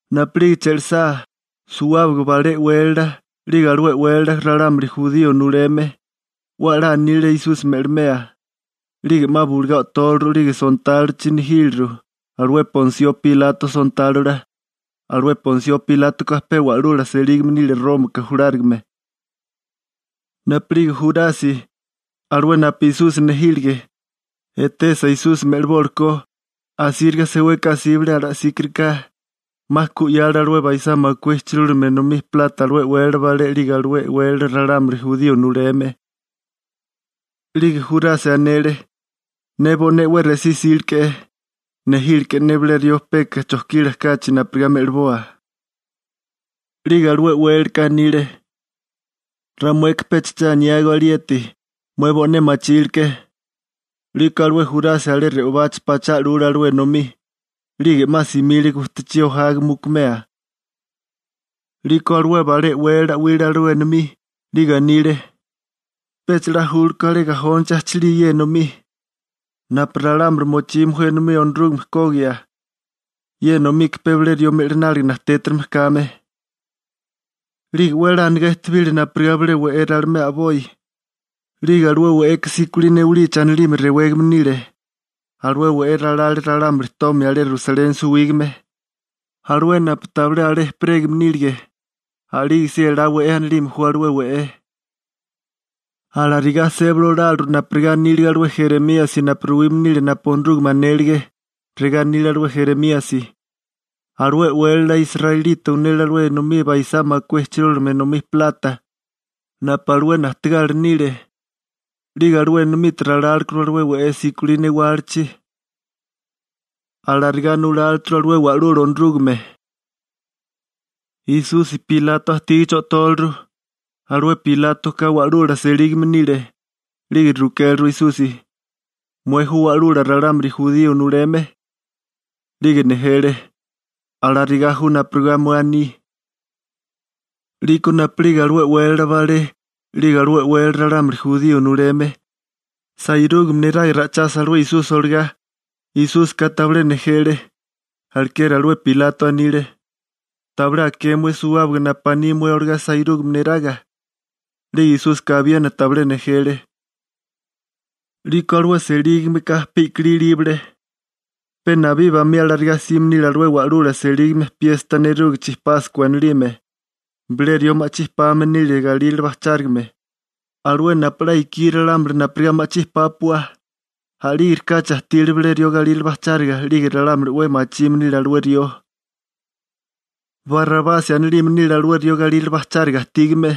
Napu'lige che'lisá, suwábaga balé e'wélala, 'lige alué e'wélala ralámuli jurío nuleme, 'we a'lá anile Esusi me'limea. 'Lige 'ma bulugá o'tóleru 'lige sontálochi nejíleru, alué Ponsio Pilato sontálola. Alué Ponsio Pilátoka pe wa'lula selígame nile Rómaka julárigame. Napu'lige Jurasi, alué napu Esusi nejílige, etesa Esusi me'libólikó, asíriga seweka asíbale ala'síkariká, 'ma ku 'yale alué baisá makué ijchirúlime enomí plata alué e'wélala balé 'lige alué e'wélala ralámuli jurío nuleme. 'Lige Jurasi anele: ―Ne bo'né 'we resí 'síleke'é. Nejíleke'é ne bilé rió peka chojkila kachi napurigá me'liboa. 'Lige alué e'wélalaka anile: ―Ramueka pecha che aniágó alieti, mué bo'né machíliké. 'Liko alué Jurasi alé re'obachi pachá 'lule alué enomí, 'lige 'ma simile gujtachí ojaga mukumea. 'Liko alué balé e'wélala 'wile alué enomí, 'lige anile: ―Pecha 'la júlkó alé gajónichi ajchilía ye enomí, napu ralámuli mochime ju enomí Onorúgame kogia, ye enomika pe bilé rió me'lináliga najtétarigime kame. 'Lige 'we a'lá anigá ejtebile napurigá bilé we'é ralimea a'boi, 'lige alué we'eka «Sikolí Newalichi» anilime rewégame nile. Alué we'é ralale ralámuli tomia alé Rusaleni suwígame, alué napu tabilé alé ejperégame nílige. A'lígesí «Elá We'é» anilime ju alué we'é. Alarigá sébali oláleru napurigá anílige alué Jeremíasi napu ruwime nile napu Onorúgame anélige. Regá anile alué Jeremíasi: «Alué e'wélala israelita unele alué enomí baisá makué ijchirúlime enomí plata, napu alué najtegala nile, 'lige alué enomite ralálekuru alué we'é Sikolí Newálichi. Alarigá nuláleturu alué Wa'lula Onorúgame.» Esusi Pilato ajtígichi o'tóleru. Alué Pilátoka wa'lula selígame nile. 'Lige rukéleru Esusi: ―¿Mué ju wa'lula ralámuli jurío nuleme? 'Lige nejele: ―Alarigá ju napurigá mué aní. 'Liko napu'lige alué e'wélala balé 'lige alué e'wélala ralámuli jurío nuleme, sairúgame neraga ra'ichasa alué Esusi olagá, Esúsika tabilé nejele. Alekeri alué Pilato anile: ―¿Tabilé aké mué suwábaga napu aní mué olagá sairúgame neraga? 'Lige Esúsika abiena tabilé nejele. 'Liko alué selígameka pe i'kilí ilíbale. Pe nabí bamí alarigá sime nile alué wa'lula selígame piesta nerúgichi Páskua anilime, bilé rió ma'chí pame nile galírale bajchárigame, alué napu 'la ikí ralámuli napurigá ma'chí pápua. A'lígerikáchi ajtile bilé rió galírale bajcháriga 'lige ralámuli 'we machime nile alué rió. Barabasi anilime nile alué rió galírale bajcháriga ajtígame.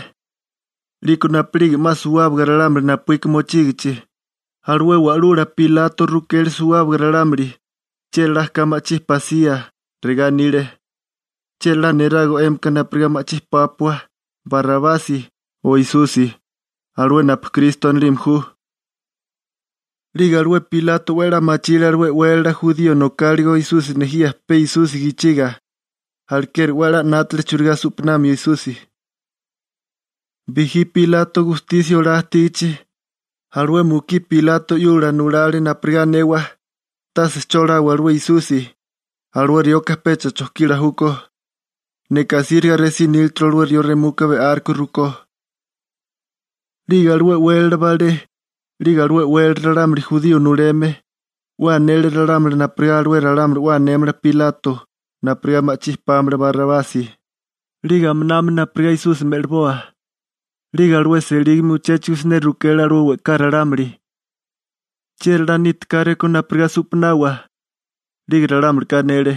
'Liko napu'lige 'ma suwábaga ralámuli napuíka mochígichi, alué wa'lula Pilato rukele suwábaga ralámuli chieri 'la ka ma'chí pasía. Regá anile: ―¿Chieri 'la nerago 'émika napurigá ma'chí pápua, Barabasi o Esusi, alué napu Kristo anilime ju? 'Lige alué Pilato 'we a'lá machile alué e'wélala jurío nokáligo Esusi nejía pe Esusi gichiga. Alekeri 'we a'lá 'nátale churigá su'panamio Esusi. Bijí Pilato gustisia olá ajtígichi, alué mukí Pilato 'yula nulale napurigá anewa: «Tase che olawa alué Esusi, alué rioka pecha chojkila júkó. Neka asíriga resí nílaturu alué rió remuka be'áruko rukó.» 'Lige alué e'wélala balé, 'lige alué e'wélala ralámuli jurío nuleme, 'we anele ralámuli napurigá alué ralámuli 'we anémala Pilato napurigá ma'chí pámala Barabasi, 'lige aminami napurigá Esusi me'liboa. 'Lige alué selígame uchéchigo siné rukele alué we'ká ralámuli: ―¿Chieri 'la niti káréko napurigá su'panawa? 'Lige ralámulika anele: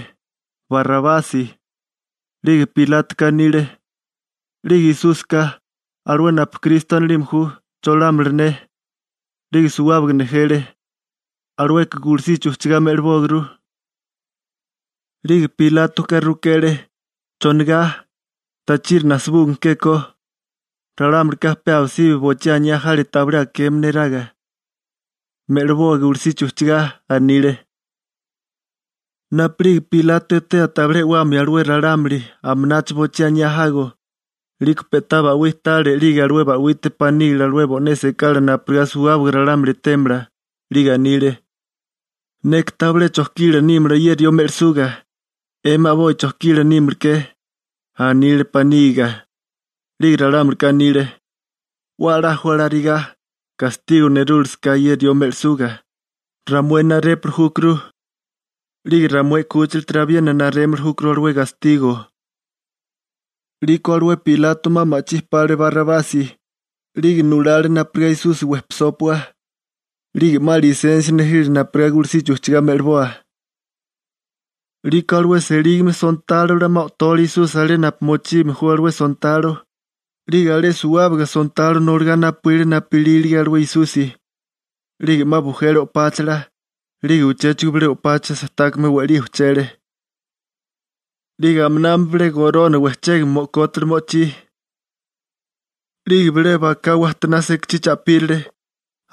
―¡Barabasi! 'Lige Pilátoka anile: ―'Lige Esúsika, alué napu Kristo anelime ju, ¿cholámala ne? 'Lige suwábaga nejele: ―¡Alueka gulusichi ujchigá me'libógurú! 'Lige Pilátoka rukele: ―¿Chonigá? ¿Tachiri najsabúgime kékó? Ralámulika pe abisibi bochí aniá jale tabilé akeme neraga: ―¡Me'liboa gulusichi ujchigá! ―anile. Napu'lige Pilato etea tabilé e'wamio alué ralámuli, aminacho boichí aniá jago, 'liko pe'tá ba'wí tale 'lige alué ba'wite panígile alué bo'né sekala napurigá suwábaga ralámuli etémala. 'Lige anile: ―Neka tabilé chojkila nímala ye rió me'lisuga. 'Emi a'boi chojkila nímalaké ―anile panígiga. 'Lige ralámulika anile: ―'We a'lá ju alarigá, gastigo nerúlasaká, ye rió me'lisuga, ramué narépuli júkuru, 'lige ramué 'kúchilatiri abiena narémili júkuru alué gastigo. 'Liko alué Pilato 'ma ma'chí pale Barabasi, 'lige nulale napurigá Esusi wejpisópua, 'lige 'ma lisensia nejile napurigá gulusichi ujchigá me'liboa. 'Liko alué selígame sontálola 'ma o'tole Esusi alé napu mochime ju alué sontalo, 'lige alé suwábaga sontalo noligá napuíle napu ilílige alué Esusi. 'Lige 'ma bujele o'páchala, 'lige uchéchigo bilé o'pacha sejtákame we'lí ujchele. 'Lige aminami bilé gorona wejchégame mo'kótale mo'chí. 'Lige bilé baká wajtoná sekachí cha'pírale,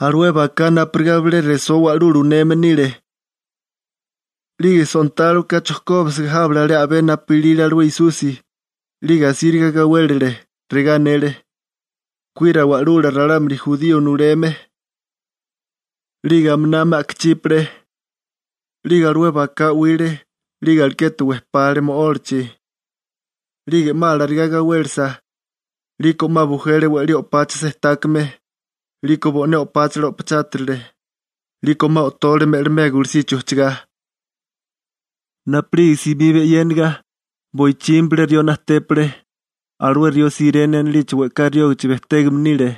alué baká napurigá bilé resó wa'lula uneme nile. 'Lige sontáloka chojkóbisiga jábele alé a'bé napu ilile alué Esusi, 'lige asíriga gawélele. Regá anele: ―¡Kuira wa'lula ralámuli jurío nuleme! 'Lige aminami a'kachípale. 'Lige alué baká 'wile, 'lige alekete wejpale mo'ólachi. 'Lige 'ma alarigá gawélesa, 'liko 'ma bujele we'lí o'pacha sejtákame, 'liko bo'né o'páchala o'pachátirile. 'Liko 'ma o'tole me'limea gulusichi ujchigá. Napu'lige simiba e'yéniga, boichimi bilé rió najtépale. Alué rió Sirene anilichi we'ká riógichi bejtégame nile.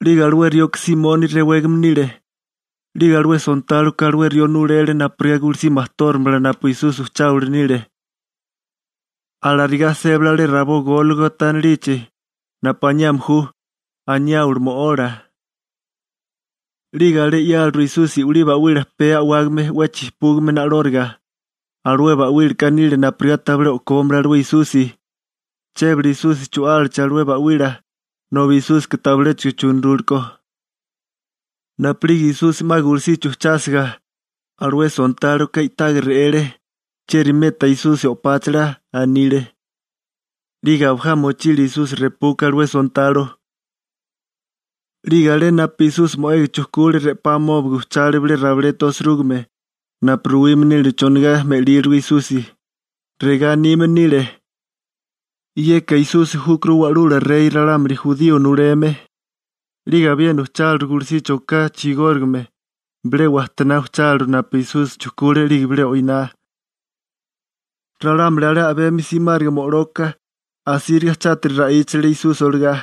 'Lige alué rioka Simoni rewégame nile. 'Lige alué sontáloka alué rió nulele napurigá gulusí majtóramala napu Esusi ujcháwili nile. Alarigá sébale alé rabó Gólgota anilichi (napu aniame ju «Anayáwali Mo'ola»). 'Lige alé 'yáleru Esusi i'wilí ba'wila pee a'wágame 'we chijpúgame na'lóriga. (Alué ba'wílaka nile napurigá tabilé o'kómala alué Esusi.) Chébale Esusi chu'álachi alué ba'wila, nobi Esúsika tabiléchigo chunurúlekó. Napu'lige Esusi 'ma gulusichi ujchásiga, alué sontáloka i'taga re'ele. «¿Chieri meta Esusi o'páchala?» anile. 'Lige abajá mochile Esusi repuka alué sontalo. 'Lige alé napu Esusi mo'ega chujkule re'pá amóbige ujchale bilé rabileta osirúgime, napu ruwime nile chonigá me'lílirugo Esusi, regá anime nile: «Yeka Esusi júkuru Wa'lula Rey ralámuli jurío nuleme.» 'Lige abiena uchucháliru gulusichi oká chigórigame, bilé wajtoná ujcháleru napu Esusi chujkule 'lige bilé o'iná. Ralámuli alé a'bemi simáriga mo'loka, asíriga chátiri ra'íchali ra'íchale Esusi olagá.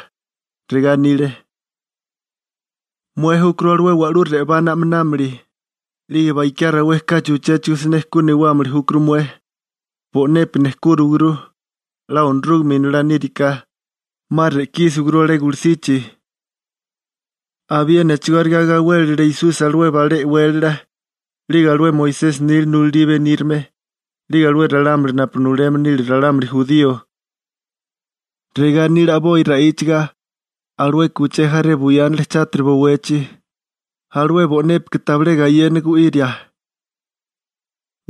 Regá anile: ―Mué júkuru alué wa'lú re'obá na'minámili, 'lige bakiá rawé kachi uchéchigo siné ku newámili júkuru mué. Bo'nepi nejkúriwaguru. 'La Onorúgame Inolá níriká, 'ma re'kísiwaguru alé gulusichi. Abiena a'chigóriga gawélile Esusi alué balé e'wélala, 'lige alué Moisesi nila nulalí benírame, 'lige alué ralámuli napu nuleme nile ralámuli jurío. Regá anile a'boi ra'íchaga: ―Alueka uché jaré buyánale chátiri bowechi, alué bo'népika tabilé gayena gu'iria.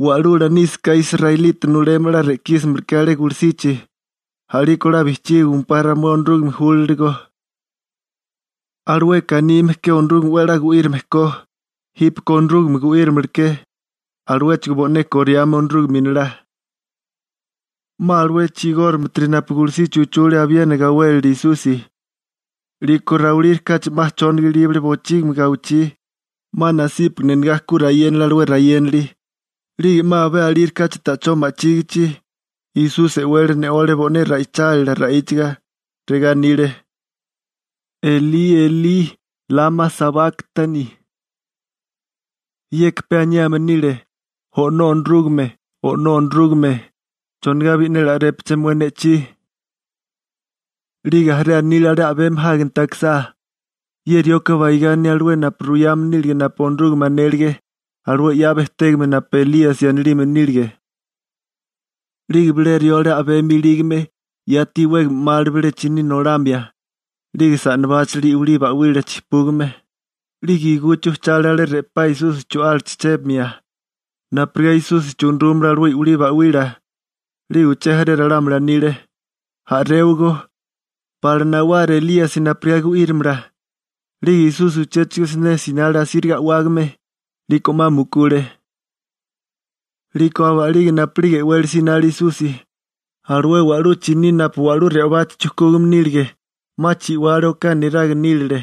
Wa'lula nísaká israelita nuleme 'la re'kísimala ke alé gulusichi, a'liko 'la bijchígiwimpá ramué Onorúgame júlaligo. Alueka anime ke Onorúgame 'we a'lá gu'írame ko, jípeko Onorúgame gu'írimalaké, aluéchigo bo'né koriame Onorúgame Inolá. 'Ma alué chigórigametiri napu gulusichi uchule abiena gawélele Esusi. 'Liko rawilírikáchi 'ma chóniga ilíbale bochígimi gawichí, 'ma nasípagana enegá ku rayénale alué rayénali, 'lige 'ma abé alírikáchi ta'chó ma'chígichi, Esusi e'wele ne'ole bo'né ra'ichálila ra'íchaga. Regá anile: ―Elí, Elí, ¿lama sabáktani? Yeka pe aniame nile, «O'nó Onorúgame, O'nó Onorúgame, ¿chonigá bi'neli a'répaché mué ne'chí?» 'Lige jaré anile alé a'bemi jáginti akisá: ―Ye rioka baigá aní alué napu ruyame nílige napu Onorúgame anélige, alué 'ya bejtégame napu Elíasi anilime nílige. 'Lige bilé rió alé a'bemi ilígame, yati iwégame 'male bilé chiní nolamia, 'lige sa'nabáchale i'wilí ba'wila chijpúgame, 'lige iguchi ujchale alé re'pá Esusi chu'álachi chébimia, napurigá Esusi chunurúmala alué i'wilí ba'wila. 'Lige uché jaré ralámuli anile: ―A'réwagó, pala nawara Elíasi napurigá gu'írimala. 'Lige Esusi uchéchigo siné sinale asíriga a'wágame. 'Liko 'ma mukule. 'Liko aba'lige napu'lige e'wele sinale Esusi, alué wa'lú chiní napu wa'lú re'obachi chujkúgame nílige, 'ma chi'wale oká neraga nílale.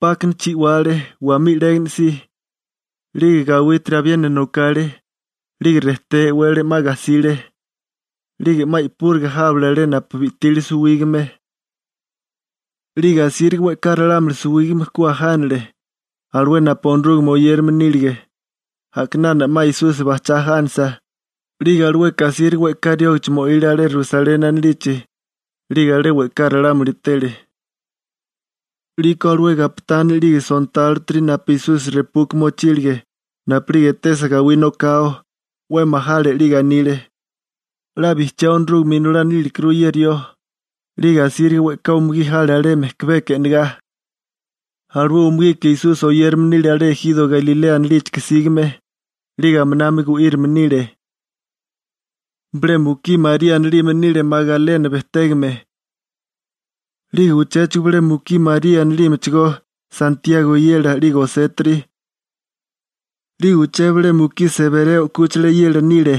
'Pákana chi'wale, wamí 'légana si. 'Lige gawítiri abiena nokale, 'lige rejté e'wele 'ma gajsile. 'Lige 'ma i'púriga jábale alé napu bi'tile suwígame. 'Lige asíriga we'ká ralámuli suwígame ku ajánele, alué napu Onorúgame oyérame nílige. A'kinana 'ma Esusi bajchá ajánasa, 'lige alueka asíriga we'ká riógachi mo'ile alé Rusaleni anilichi, 'lige alé we'ká ralámuli etele. 'Liko alué gapitani 'lige sontálotiri napu Esusi repuka mochílige, napu'lige etesa gawí nokao, 'we majale 'lige anile: ―'La bijchiá Onorúgame Inolá nílekuru ye rió. 'Lige asíriga we'ká umugí jale alé mejkabeka e'negá. Alué umugika Esusi oyérame nile alé ejiro Galilea anilíchika sígame, 'lige aminami gu'írame nile. Bilé mukí María anilime nile Magalena bejtégame. 'Lige uchéchigo bilé mukí María anilímechigó, Santiago eyela 'lige Osétiri. 'Lige uché bilé mukí Sebereo 'kúchila eyela nile.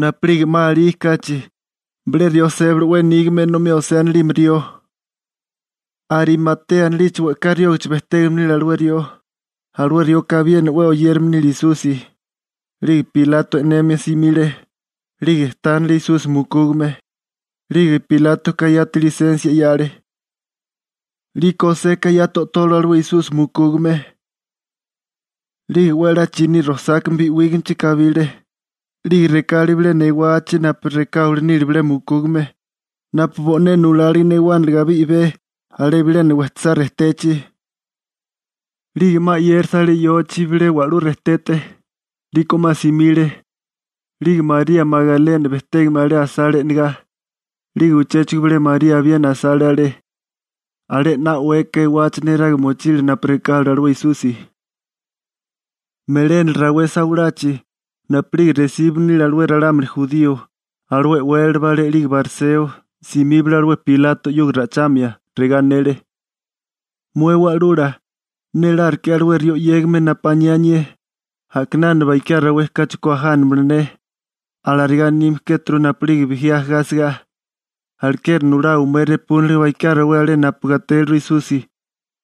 Napu'lige 'ma alí kachi, bilé rió sébale 'we nígame enomí José anilime rió. Arimatea anilichi we'ká riógichi bejtégame nile alué rió. Alué rioka abiena 'we oyérame nile Esusi. 'Lige Pilato e'nemia simile, 'lige tánale Esusi mukúgame. 'Lige Pilátoka yati lisensia 'yale. 'Liko Joseka yati o'tole alué Esusi mukúgame. 'Lige 'we a'lá chiní rosákame bi'wígamechi kabile, 'lige rekale bilena ewachi napu rekáwili nile bilé mukúgame, napu bo'né nulálige newániliga abé i'bé alé bilena wejtosá rejtechi. 'Lige 'ma 'yérasa alé yochi bilé wa'lú rejtete, 'liko 'ma simile. 'Lige María Magalena bejtégame alé asale e'negá, 'lige uchéchigo bilé María abiena asale alé, alé 'na o'weka ewachi neraga mochile napu rekáleru alué Esusi. Melénala rawé sawalachi, napu'lige resíbame nile alué ralámuli jurío, alué e'wélala balé 'lige bariseo, simíbale alué Pilato 'yuga ra'ichamia. Regá anele: ―Mué Wa'lula, néláruke'é alué rió 'yégame napu aniá anié: «A'kinana bakiá rawé kachi ku ajánamala ne.» Alarigá anime kéturu napu'lige bijí ajagá asigá. Alekeri nulawa mué repúniliga bakiá rawé alé napu gatéliru Esusi,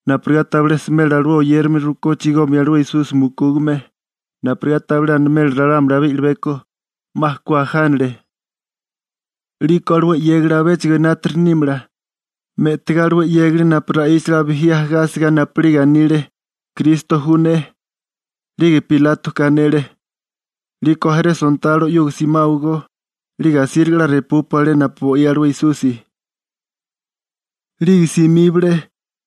napurigá tabilé smela alué oyérame rukó chigomia alué Esusi mukúgame, napurigá tabilé animela ralámuli abé i'libeko: «'Ma ku ajánale.» 'Liko alué 'yégali abéchigo enátiri nímala, me'tigá alué 'yégali napu ra'íchale abijí ajagá asigá napu'lige anile, «Kristo ju ne.» 'Lige Pilátoka anele: ―'Liko jaré sontalo 'yuga simáwagó, 'lige asíriga 'la repúpua alé napu bo'í alué Esusi. 'Lige simíbale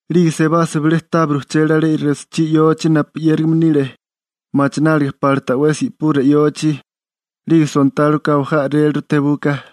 'lige sebasa bile tábiri ujchele alé resochí yochi napu 'yérigame nile, machináliga pala ta'wesi i'pura yochi. 'Lige sontáloka abajá a'réleru tebuka.